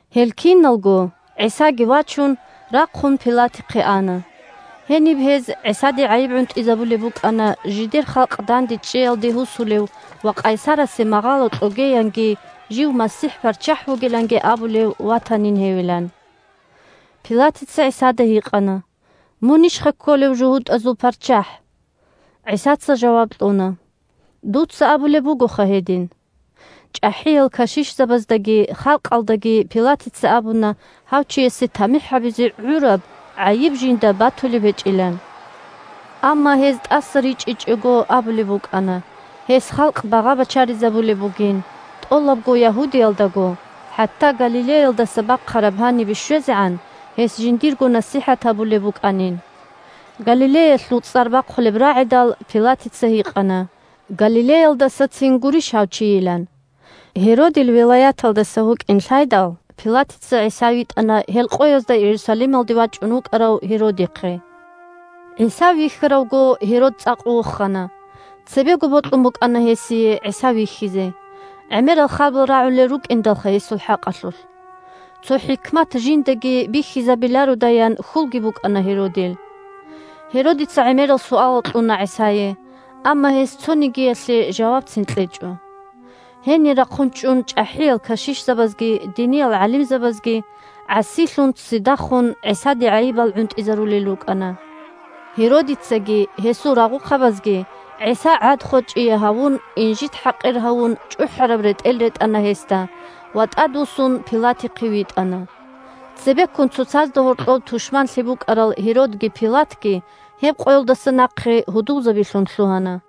Гьел киналго, ГӀисаги вачун, рахъун Пилатихъе ана. Гьениб гьез ГӀисаде гӀайиб гӀунтӀизабулеб букӀана, жидер халкъ дандечӀеялде гьусулев ва къайсарасе магъало кьогеянги жив МасихӀ-ПарччахӀ вугиланги абулев ватанин гьевилан. Пилатица ГӀисада гьикъана: – Мунищха кколев жугьутӀазул ПарччахӀ? ГӀисаца жаваб кьуна: – Дуца абулеб бугоха гьедин. ЧӀахӀиял кашишзабаздаги халкъалдаги Пилатица абуна гьав чиясе тамихӀ гьабизе гӀураб гӀайиб жинда батулеб гьечӀилан. Амма гьез тӀаса ричӀичӀого абулеб букӀана гьес халкъ багъа-бачаризабулеб бугин, тӀолабго Ягьудиялдаго, хӀатта Галилеялдаса бахъараб гьанибе щвезегӀан, гьес жиндирго насихӀат гьабулеб букӀанин. Галилеялъул цӀар бахъулеб рагӀидал, Пилатица гьикъана Галилеялдасацин гурищ гьав чийилан. Гьеродил вилаяталдаса вукӀин лъайдал, Пилатица ГӀиса витӀана гьел къоязда Иерусалималде вачӀун вукӀарав Гьеродихъе. ГӀиса вихьаравго, Гьерод цӀакъ вохана. Цебего бокьун букӀана гьесие ГӀиса вихьизе, гӀемерал харбал рагӀулел рукӀиндалха гьесул хӀакъалъулъ. Цо хӀикмат жиндаги бихьизабилародаян хьулги букӀана Гьеродил. Гьеродица гӀемерал суалал кьуна ГӀисае, амма гьес цонигиялъе жавабцин кьечӀо. Гьенир рахъун чӀун чӀахӀиял кашишзабазги диниял гӀалимзабазги гӀасилъун-ццидахун ГӀисаде гӀайибал гӀунтӀизарулел рукӀана. Гьеродицаги гьесул рагъухъабазги ГӀиса гӀад-хочӀие гьавун, инжит-хӀакъир гьавун чӀухӀараб ретӀел ретӀана гьесда ва тӀадвуссун Пилатихъе витӀана. Цебеккун цоцазда гьоркьоб тушманлъи букӀарал Гьеродги Пилатги гьеб къоялдаса нахъе гьудулзабилъун лъугьана.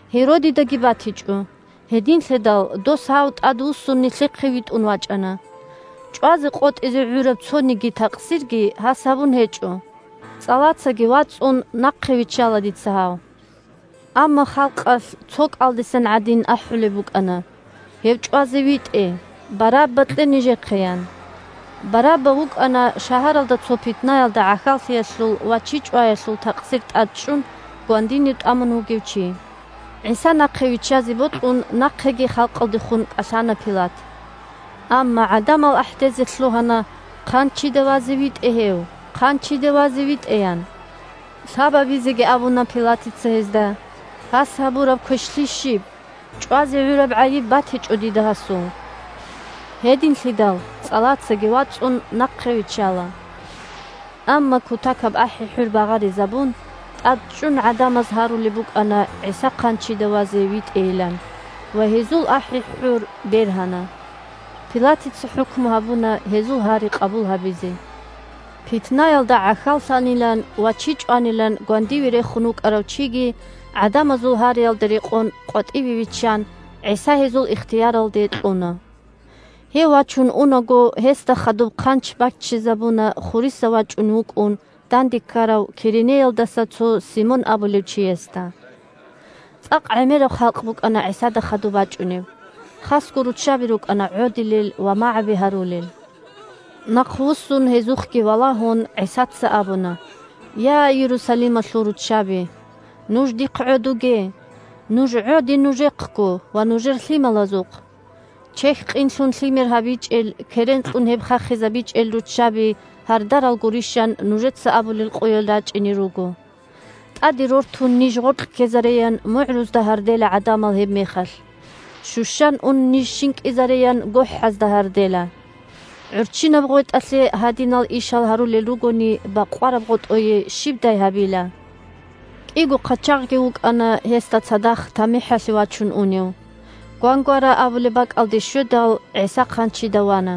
Гьеродидаги батичӀо, гьединлъидал дос гьав тӀадвуссун нилъехъе витӀун вачӀана. ЧӀвазе къотӀизе гӀураб цониги такъсирги гьас гьабун гьечӀо. ЦӀалацаги вацӀун, нахъе виччала дица гьав. Амма халкъалъ цо кӀалдисан гӀадин ахӀулеб букӀана: – Гьев чӀвазе витӀе! Барабба кье нижехъе! – ян. Барабба вукӀана, шагьаралда цо питнаялда гӀахьаллъиялъул ва чи чӀваялъул такъсир тӀад чӀун, гвандинив тӀамун вугев чи. ГӀиса нахъе виччазе бокьун нахъеги халкъалдехун кӀалъана Пилат. Амма гӀадамал ахӀдезе лъугьана: – Хъанчида вазе витӀе гьев! Хъанчида вазе витӀе! – ян. Лъабабизеги абуна Пилатица гьезда: – Гьас гьабураб квешлъи щиб? ЧӀвазе гӀураб гӀайиб батичӀо дида гьасул. Гьединлъидал, цӀалацаги вацӀун, нахъе виччала. Амма, кутакаб ахӀи-хӀур багъаризабун, тӀадчӀун гӀадамаз гьарулеб букӀана ГӀиса хъанчида вазе витӀейилан, ва гьезул ахӀи-хӀур бергьана. Пилатица хӀукму гьабуна гьезул гьари къабул гьабизе: питнаялда гӀахьаллъанилан ва чи чӀванилан гвандиниве рехун вукӀарав чиги, гӀадамазул гьариялда рекъон, къватӀиве виччан, ГӀиса гьезул ихтияралде кьуна. Гьев вачун унаго, гьесда хадуб хъанч баччизабуна хуриса вачӀунев вукӀун данде ккарав Киренеялдаса цо Симон абулев чиясда. ЦӀакъ гӀемераб халкъ букӀана ГӀисада хадуб бачӀунеб, хасго руччаби рукӀана гӀодилел ва магӀаби гьарулел. Нахъвуссун гьезухъги валагьун, ГӀисаца абуна: – Я, Иерусалималъул руччаби! Нуж дихъ гӀодуге! Нуж гӀоде нужехъго ва нужер лъималазухъ. «Чехь къинлъун лъимер гьабичӀел, керен кьун гьеб хахизабичӀел руччаби гьардарал гурищ!» – ан нужеца абулел къоял рачӀине руго. ТӀаде рортун ниж гъоркь ккезареян мугӀрузда гьардела гӀадамал гьебмехалъ, щущан ун ниж щинкӀизареян гохӀазда гьардела. ГӀурччинаб гъветӀалъе гьадинал ишал гьарулел ругони, – бакъвараб гъотӀое щибдай гьабила! КӀиго хъачагъги вукӀана гьесда цадахъ тамихӀалъе вачун унев. «Гвангвара» абулеб бакӀалде щведал, ГӀиса хъанчида вана;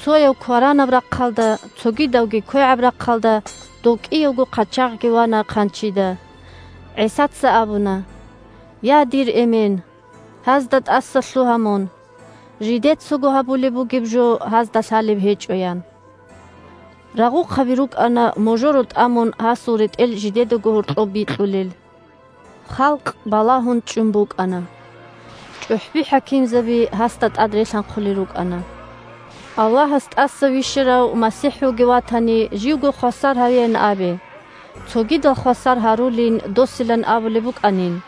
цояв кваранаб рахъалда, цогидавги квегӀаб рахъалда – дов кӀиявго хъачагъги вана хъанчида. ГӀисаца абуна: – Я, дир Эмен! Гьазда тӀасалъугьа мун. Жидецаго гьабулеб бугеб жо гьазда лъалеб гьечӀо, – ян. Рагъухъаби рукӀана, можоро тӀамун, гьасул ретӀел жидедаго гьоркьоб бикьулел. Халкъ балагьун чӀун букӀана. ЧӀухӀби-хӀакимзаби гьасда тӀад релъанхъулел рукӀана: – Аллагьас тӀаса вищарав МасихӀ вугев ватани, живго хвасар гьавеян абе, цогидал хвасар гьарулин досилан абулеб букӀанин.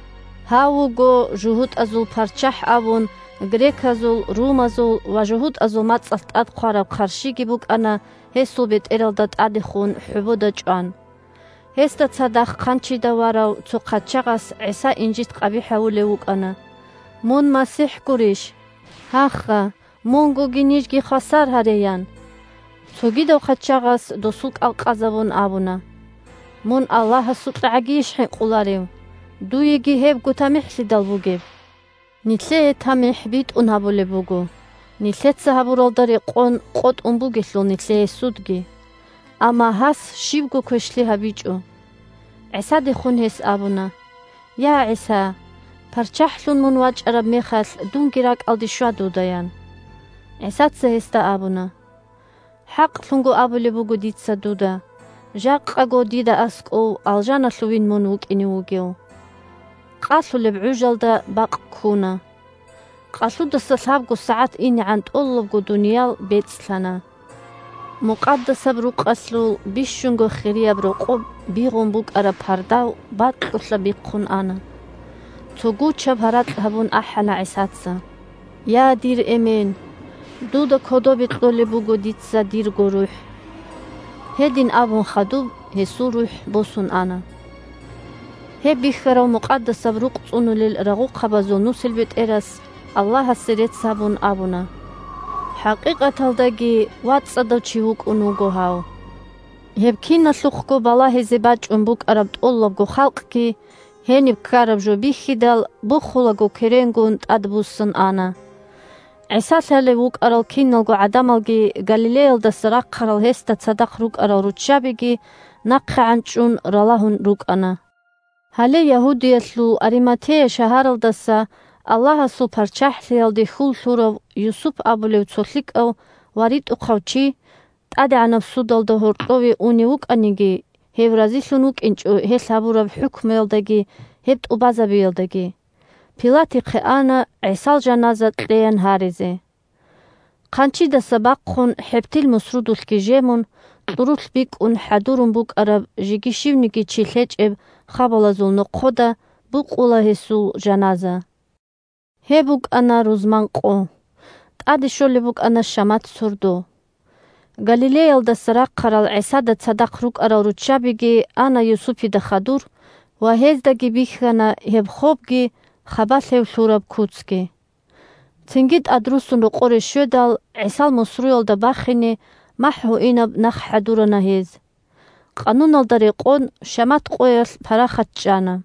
«Гьав вуго жугьутӀазул парччахӀ» абун греказул, румазул ва жугьутӀазул мацӀалъ тӀад хъвараб хъарщиги букӀана гьесул бетӀералда тӀадехун хӀобода чӀван. Гьесда цадахъ хъанчида варав цо хъачагъас ГӀиса инжит-къабихӀ гьавулев вукӀана: – Мун МасихӀ гурищ? Гьаха, мунгоги нижги хвасар гьаре, – ян. Цогидав хъачагъас, досул кӀал къазабун, абуна: – Мун АллагьасукьагӀагийищ хӀинкъуларев? Дуеги гьебго тамихӀлъидал бугеб! Нилъее тамихӀ битӀун гьабулеб буго, нилъеца гьабуралда рекъон къотӀун бугелъул нилъее судги. Амма гьас щибго квешлъи гьабичӀо. ГӀисадехун гьес абуна: – Я, ГӀиса, ПарччахӀлъун мун вачӀараб мехалъ, дунги ракӀалде щва дуда, – ян. ГӀисаца гьесда абуна: – ХӀакълъун абулеб буго дица дуда: жакъаго дида аскӀов алжаналъувин мун вукӀине вугев! Къалъулеб гӀужалда бакъ ккуна. Къалъудаса лъабго сагӀат инегӀан тӀолабго дуниял бецӀлъана. Мукъадасаб Рукъалъул бищунго хирияб рокъоб бигъун букӀараб пардав бакьулъа бихъун ана. Цо гучаб гьаракь гьабун ахӀана ГӀисаца: – Я, дир Эмен! Дуда кодобе кьолеб буго дица дирго рухӀ! Гьедин абун хадуб гьесул рухӀ босун ана. Гьеб бихьарав Мукъадасаб Рукъ цӀунулел рагъухъабазул нусилбетӀерас, Аллагьасе рецц гьабун, абуна: – ХӀакъикъаталдаги вацӀцӀадав чи вукӀун вуго гьав. Гьеб киналъухъго балагьизе бачӀун букӀараб тӀолабго халкъги, гьениб ккараб жо бихьидал, бухулаго керенгун, тӀадбуссун ана. ГӀиса лъалев вукӀарал киналго гӀадамалги Галилеялдаса рахъарал гьесда цадахъ рукӀарал руччабиги нахъегӀан чӀун ралагьун рукӀана. Гьале Ягьудиялъул Ариматея шагьаралдаса Аллагьасул ПарччахӀлъиялде хьул лъурав Юсуп абулев цо лъикӀав ва ритӀухъав чи (тӀадегӀанаб судалда гьоркьове унев вукӀаниги, гьев разилъун вукӀинчӀо гьелъ гьабураб хӀукмуялдаги гьеб тӀубазабиялдаги), – Пилатихъе ана ГӀисал жаназа кьеян гьаризе. Хъанчидаса бахъун, хӀебтил мусрудулъги жемун, кьурулъ бикӀун хӀадурун букӀараб жеги щивниги чи лъечӀеб хабалазул нохъода букъула гьесул жаназа. Гьеб букӀана рузман къо, тӀаде щолеб букӀана шамат сордо. Галилеялдаса рахъарал ГӀисада цадахъ рукӀарал руччабиги ана Юсупида хадур ва гьездаги бихьана гьеб хобги хабалъ гьев лъураб куцги. Цинги тӀадруссун рокъоре щведал, ГӀисал мусруялда бахине махӀгьуинаб нах хӀадурана гьез. Къануналда рекъон, шамат къоялъ парахат чӀана.